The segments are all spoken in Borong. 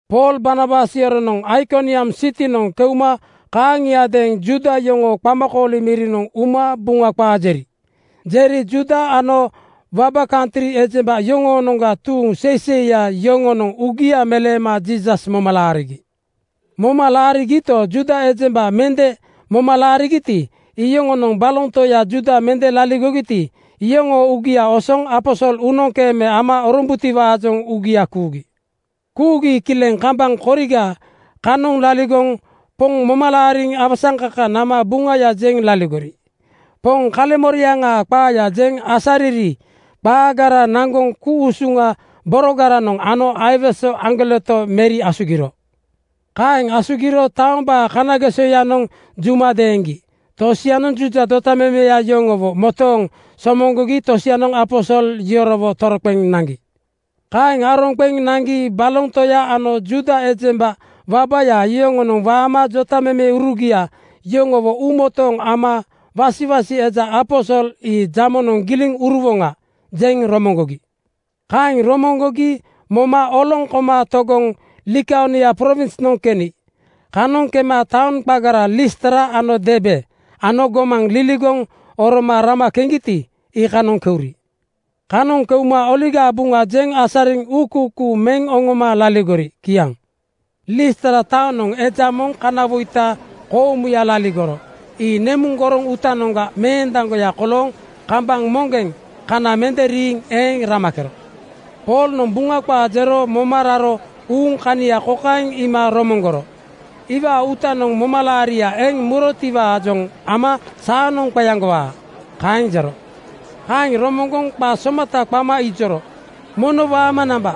Pool Barnabas yoronoŋ Aikoniam sitinoŋ keuma kaaŋiadeeŋ Juuda yoŋoo qamakooli mirinoŋ uma Buŋa qaa jeri. Jeri Juuda ano waba kantri ejemba yoŋoonoŋga tuuŋ seiseiya yoŋonoŋ uugia meleema Jiisas moma laarigi. Moma laarigito, Juuda ejemba mende moma laarigiti, iyoŋonoŋ baloŋ toya Juuda mende laligogiti, iyoŋoo uugia osoŋ aposol uunoŋkeeme ama orombutiwaajoŋ uugia kuugi. Kuugi kileŋ kambaŋ koriga kanoŋ laligoŋ Poŋ moma laariŋ awasaŋkaka nama Buŋaya jeŋ laligori. Poŋ kaleŋmoriaŋaa qaaya jeŋ asariri qaagara naŋgoŋ ku-usuŋa borogaranoŋ ano aiwese aŋgoleto meri asugiro. Kaeŋ asugiro taombaa kanagesoyanoŋ juma deeŋgi. Tosianoŋ Juuda jotamemeya yoŋowo motooŋ somoŋgogi tosianoŋ aposol yorowo toroqeŋ naŋgi. Kaeŋ aroŋ qeŋ naŋgi baloŋ toya ano Juuda ejemba wabaya yoŋonoŋ waama jotamemeurugia yoŋowo uumotooŋ ama wasiwasi eja aposol ii “Jamonoŋ giliŋ uruwoŋa!” jeŋ romoŋgogi. Kaeŋ romoŋgogi moma oloŋ koma togoŋ Likaonia prowinsnoŋ keni. Kanoŋ kema taoŋ qagara Listra ano Derbe ano gomaŋ liligoŋ oroma rama keŋgiti, iikanoŋ keuri. Kanoŋ keuma Oligaa Buŋa jeŋ asariŋ uukuukuu meŋ oŋoma laligori. Kiaŋ. Listra taonoŋ eja moŋ kanawoita koomuya laligoro. Ii nemuŋ goroŋ uutanoŋga meendaŋgoya kolooŋ kambaŋ moŋgeŋ kana mende riiŋ eeŋ ramakero. Poolnoŋ Buŋa qaa jero moma raro uuŋ kania kokaeŋ iima romoŋgoro, “Iwaa uutanoŋ momalaaria eŋ murotiwaajoŋ ama saanoŋ qeaŋgowaa,” kaeŋ jero. Kaeŋ romoŋgoŋ qa somata qama ijoro, “Mono waama namba.”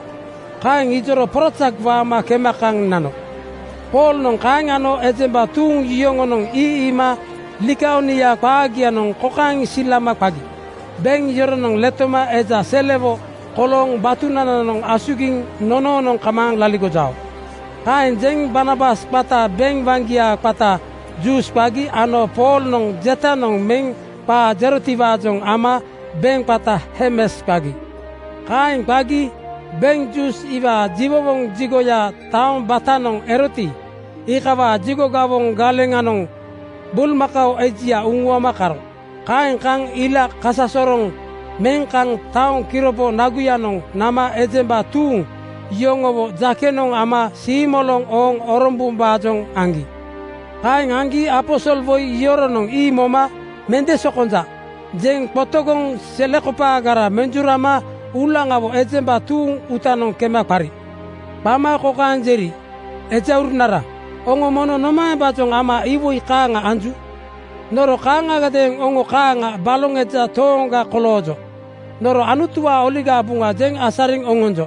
Kaeŋ ijoro porazak waama kema kaŋ nano. Poolnoŋ kaeŋ ano ejemba tuuŋ yoŋonoŋ ii iima Likaonia qaagianoŋ kokaeŋ silama qagi, “Beŋ yoronoŋ letoma eja selewo kolooŋ batunananoŋ asugiŋ nonoonoŋ kamaaŋ laligojao.” Kaeŋ jeŋ Barnabas qata beŋ waŋgia qata Zuus qagi ano Poolnoŋ jetanoŋ meŋ qaa jerotiwaajoŋ ama beŋ qata Hermes qagi. Kaeŋ qagi beŋ Zuus iwaa jiwowoŋ jigoya taoŋ batanoŋ eroti, iikawaa jigo gawoŋ galeŋanoŋ bulmakao ejia uŋuama karo. Kaeŋ kaŋ ila kasasoroŋ meŋ kaŋ taoŋ kiropo naguyanoŋ nama ejemba tuuŋ yoŋowo jakenoŋ ama siimoloŋ ooŋ orombombaajoŋ aŋgi. Kaeŋ aŋgi aposolwoi yoronoŋ ii moma “Mende sokonja,” jeŋ qotogoŋ selekopaagara menjurama uulaŋawo ejemba tuuŋ uutanoŋ kema qari. Qama kokaeŋ jeri, “Ejaurunara, oŋo mono nomaembaajoŋ ama iwoi kaaŋa anju? Noro kaaŋagadeeŋ oŋo kaaŋa baloŋ eja tooŋga koloojo. Noro Anutuwaa Oligaa Buŋa jeŋ asariŋ oŋonjo.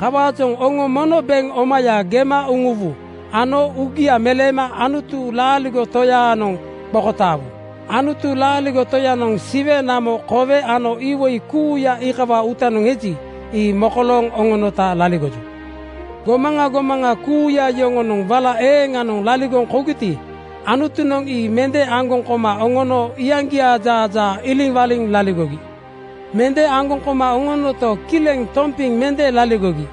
Kawaajoŋ oŋo mono beŋ omaya gema uŋuwu ano uugia meleema Anutu laaligo Toyaanoŋ qokotaawu. Anutu laaligo Toyanoŋ Siwe, namo, kowe ano iwoi kuuya iikawaa uutanoŋ eji, ii mokolooŋ oŋonota laligoju. Gomaŋa gomaŋa kuuya yoŋonoŋ wala eeŋanoŋ laligoŋ kougiti, Anutunoŋ ii mende aŋgoŋ koma oŋono iyaŋgiaa jaajaa iliŋwaliŋ laligogi. “Mende aŋgoŋ koma oŋonoto, kileŋ tompiŋ mende laligogi.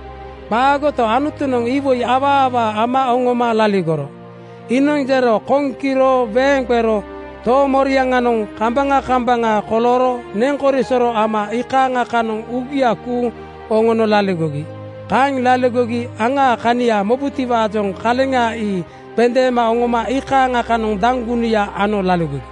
Qaagoto, Anutunoŋ iwoi awaa awaa ama oŋoma laligoro. Iinoŋ jero koŋ kiro weeŋ qero toomoriaŋanoŋ kambaŋa kambaŋa kolooro neŋkorisoro ama iikaaŋa kanoŋ uugia kuuŋ oŋono laligogi. Kaeŋ laligogi aŋaa kania mobutiwaajoŋ kaleŋa ii qendeema oŋoma iikaaŋa kanoŋ daŋgunuya ano laligogi.”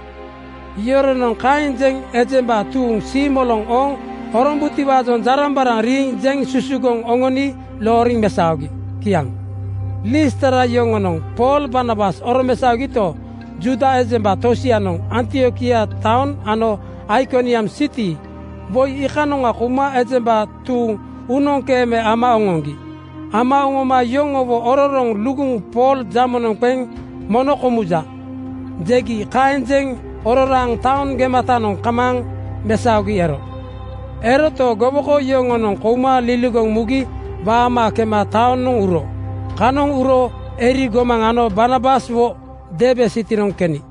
Yoronoŋ kaeŋ jeŋ ejemba tuuŋ siimoloŋ ooŋ orombutiwaajoŋ jarambaraŋ riiŋ jeŋ susugoŋ oŋoni looriŋ mesaogi. Kiaŋ. Listra yoŋonoŋ Pool Barnabas oromesaogito, Juuda ejemba tosianoŋ Antiokia taoŋ ano Aikoniam siti woi iikanoŋa kouma ejemba tuuŋ uunoŋkeeme ama oŋoŋgi. Ama oŋoma yoŋowo ororoŋ luguŋ Pool jamonoŋ qeŋ “Mono komuja!” jegi. Kaeŋ jeŋ ororaaŋ taoŋ gematanoŋ kamaaŋ mesaogi ero. Eroto, gowoko yoŋonoŋ kouma liligoŋ mugi waama kema taonoŋ uro. Kanoŋ uro eri gomaŋ ano Barnabaswo Derbe sitinoŋ keni.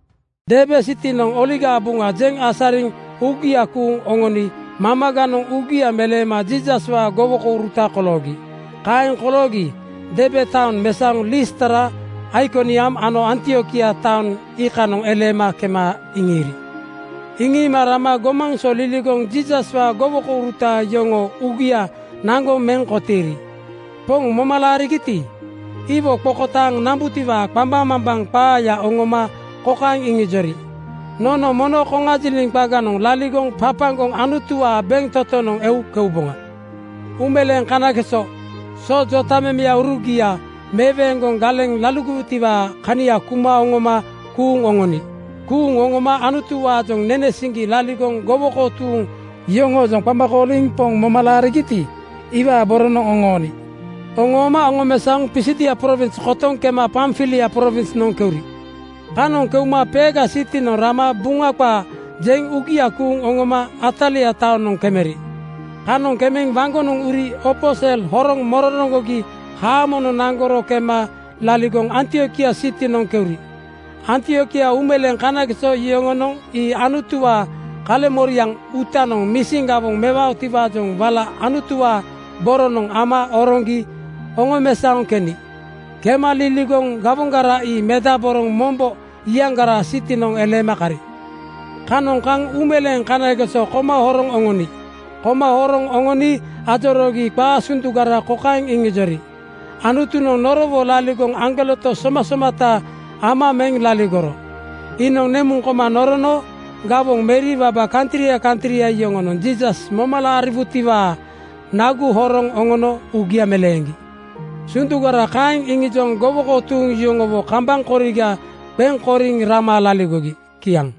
Derbe sitinoŋ Oligaa Buŋa jeŋ asariŋ uugia kuuŋ oŋoni mamaganoŋ uugia meleema Jiisaswaa gowokouruta koloogi. Kaeŋ koloogi Derbe taoŋ mesaoŋ Listra, Aikoniam ano Antiokia taoŋ iikanoŋ eleema kema iŋiiri. Iŋiima rama gomaŋ so liligoŋ Jiisaswaa gowokouruta yoŋoo uugia naŋgoŋ meŋ kotiiri. Poŋ moma laarigiti, iwo qokotaaŋ nambutiwaa qambaŋmambaŋ qaaya oŋoma kokaeŋ iŋijori, “Nono mono koŋajiliŋ qaganoŋ (lombo kania kania mokolooŋ) laligoŋ papaŋgoŋ Anutuwaa bentotonoŋ eu keuboŋa.” Uumeleeŋ kanageso so jotamemeurugia meweeŋgoŋ galeŋ laligowutiwaa kania kuma oŋoma kuuŋ oŋoni. Kuuŋ oŋoma Anutuwaajoŋ nene siŋgi laligoŋ gowoko tuuŋ yoŋoojoŋ qama kooliŋ Poŋ moma laarigiti, iwaa boronoŋ oŋooni. Oŋooma oŋomesaoŋ Pisidia prowins kotoŋ kema Pamfilia prowinsnoŋ keuri. Kanoŋ keuma Perga sitinoŋ rama Buŋa qaa jeŋ uugia kuuŋ oŋoma Atalia taonoŋ kemeri. Kanoŋ kemeŋ waŋgonoŋ uri opo sel horoŋ mororoŋgogi haamonoŋ naŋgoro kema laligoŋ Antiokia sitinoŋ keuri. Antiokia uumeleeŋ kanageso yoŋonoŋ ii Anutuwaa kaleŋmoriaŋ uutanoŋ misin gawoŋ mewaotiwaajoŋ wala Anutuwaa boronoŋ ama oroŋgi oŋomesaoŋ keni. Kema liligoŋ gawoŋgara ii medaboroŋ mombo iyaŋgaraa sitinoŋ eleema kari. Kanoŋ kaŋ uumeleeŋ kanageso koma horoŋ oŋoni. Koma horoŋ oŋoni ajoroogi qaa sundugara kokaeŋ iŋijori, “Anutunoŋ norowo laligoŋ aŋgoleto somasomata ama meŋ laligoro. Iinoŋ nemuŋ koma norono gawoŋ meri waba kantria kantria yoŋonoŋ Jiisas moma laariwutiwaa nagu horoŋ oŋono uugia meleeŋgi.” Sundugara kaeŋ iŋijoŋ gowoko tuuŋ yoŋowo kambaŋ koriga qeŋ koriŋ rama laligori. Kiaŋ.